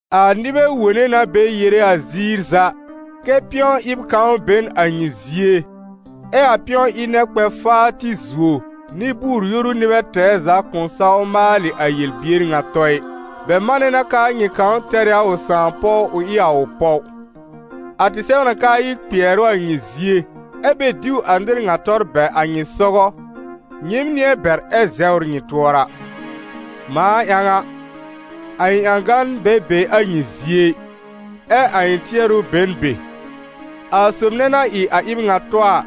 A nɩbɛ wone na bɛ yere a ziir za kɛ pɩ̃ɔ-ɩb kãw be n a nyɩ zie, ɛ a pɩ̃ɔ-ɩb nɛ kpɛ faa tɩ zuo, nɩ-bʋʋr-yoru nɩbɛ tɛɛ za kʋ̃ saw maalɩ a yel-bier ŋa tɔ ɩ. Bɛ manɛ na k'aa nyɩ kãw tɛr ɩ a ʋ sãà pɔw ʋ ɩ a ʋ pɔw. A tɩ sɛw na k'aa ɩ kpɩɛrʋ a nyɩ zie, ɛ́ bɛ diw a nɩr ŋa tɔ bɛr a nyɩ sɔgɔ, nyɩɩm nɩ̃ɛ bɛr ɛ zɛwr nyɩ tʋɔra. Mãa ƴãw a, a ɩ̃ ƴãgan bɛ be a nyɩ zie ɩ, ɛ a ɩ̃ tɩɛrʋ be n be a sob nɛ na ɩ a ɩb ŋa tɔ a,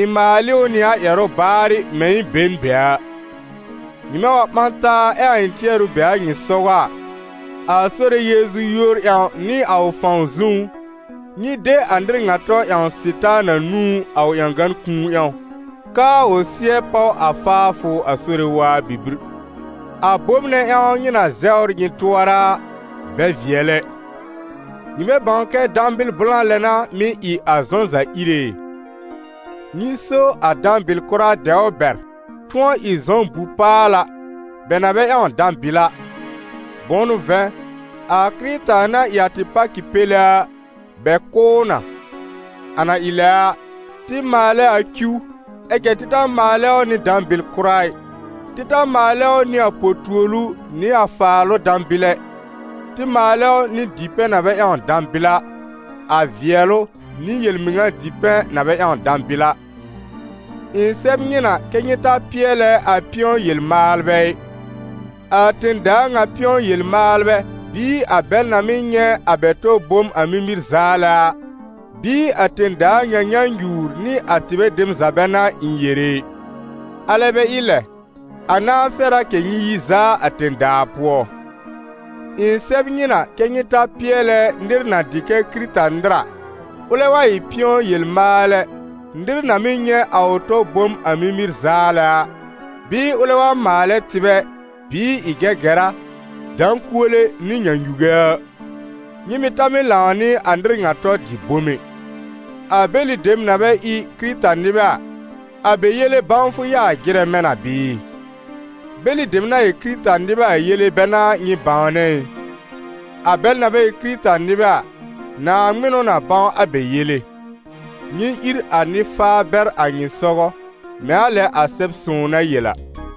ɩ̃ maal ɩ ʋ nɩ a ƴɛrʋ baarɩ mɛ̃ ɩ̃ be n be a. Nyɩmɛ wa ɓã taa ɛ a ɩ̃ tɩɛrʋ be a nyɩ sɔgɔ a, a Sore Yeezu yúor ƴãw nɩ a ʋ fãw zũú, nyɩ de a nɩr ŋa tɔ ƴãw Sɩtaana nũú a ʋ ƴãgan kũu ƴãw, k'aa ʋ sɩ́ɛ páw a faafʋ a Sore waa bibir. A bom nɛ ƴãw nyɩ na zɛwr nyɩ tʋɔra a, bɛ vɩɛl ɛ. Nyɩ bɛ bãw kɛ dãbɩl blã lɛ n'a mɩ́ ɩ a zɔ̃ za ìr ɛ? Nyɩ so a dãbɩl-kʋra dɛwr bɛr tʋ̃ɔ ɩ zɔ̃-bu-paala, bɛ na bɛ ƴãw dãbɩl a. Bʋ̃ʋ n'ʋ vɛ̃, a Kɩrɩta na ɩ a tɩ Pakɩ péle a, bɛ kʋ́ ʋ na. A na ɩ lɛ a, tɩ maalɛ a cuw, ɛ cɛ tɩ ta maalɛ ʋ nɩ dãbɩl-kʋra ɩ, tɩ ta maalɛ ʋ nɩ a potuolu nɩ a faalʋ dãbɩl ɛ, tɩ maalɛ ʋ nɩ dipɛ̃ na bɛ ƴãw dãbɩl a: a vɩɛlʋ nɩ yel-mɩŋa dipɛ̃ na bɛ ƴãw dãbɩl a. Ɩ̃ sɛb nyɩ na kɛ́ nyɩ ta pɩɛlɛ a pɩ̃ɔ-yel-maalbɛ ɩ. A tẽ-daa ŋa pɩ̃ɔ-yel-maalbɛ bɩɩ a bɛl na mɩ́ nyɛ̃ a bɛ tɔ bom a mimir zaalɛ a, bɩɩ a tẽ-daa ŋa nyãnyuwr nɩ a tɩbɛ dem za bɛ n'a ɩ̃ yere ɩ, alɛ bɛ ɩ lɛ, a nãa fɛr a kɛ̀ nyɩ yi zaa a tẽ-daa pʋɔ. Ɩ̃ sɛb nyɩ na kɛ́ nyɩ ta pɩɛlɛ nɩr na dɩ kɛ Kɩrɩta-nɩr a, ʋlɛ wa ɩ pɩ̃ɔ-yel-maalɛ, nɩr na mɩ́ nyɛ̃ a ʋ tɔ bom a mimir zaalɛ a, bɩɩ ʋlɛ wa maalɛ tɩbɛ bɩɩ ɩ gɛgɛra, dã-kuole nɩ nyãnyuge a. Nyɩ mɩ̀ ta mɩ́ lãw nɩ a nɩr ŋa tɔ dɩ bom ɛ. A bɛlɩ dem na bɛ ɩ Kɩrɩta-nɩbɛ a, a bɛ yele bãwfʋ ya jɩrɛ mɛ̃ na bɩɩ? Bɛlɩ dem na ɩ Kɩrɩta-nɩbɛ a yele bɛ n'a nyɩ bãwnɛ ɩ? A bɛl na bɛ ɩ Kɩrɩta-nɩbɛ a, Naaŋmɩn n'ʋ na bãw a bɛ yele. «Nyɩ ír a nɩ-faa bɛr a nyɩ sɔgɔ», mɛ̃ a lɛ a Sɛb-sõw na yel a.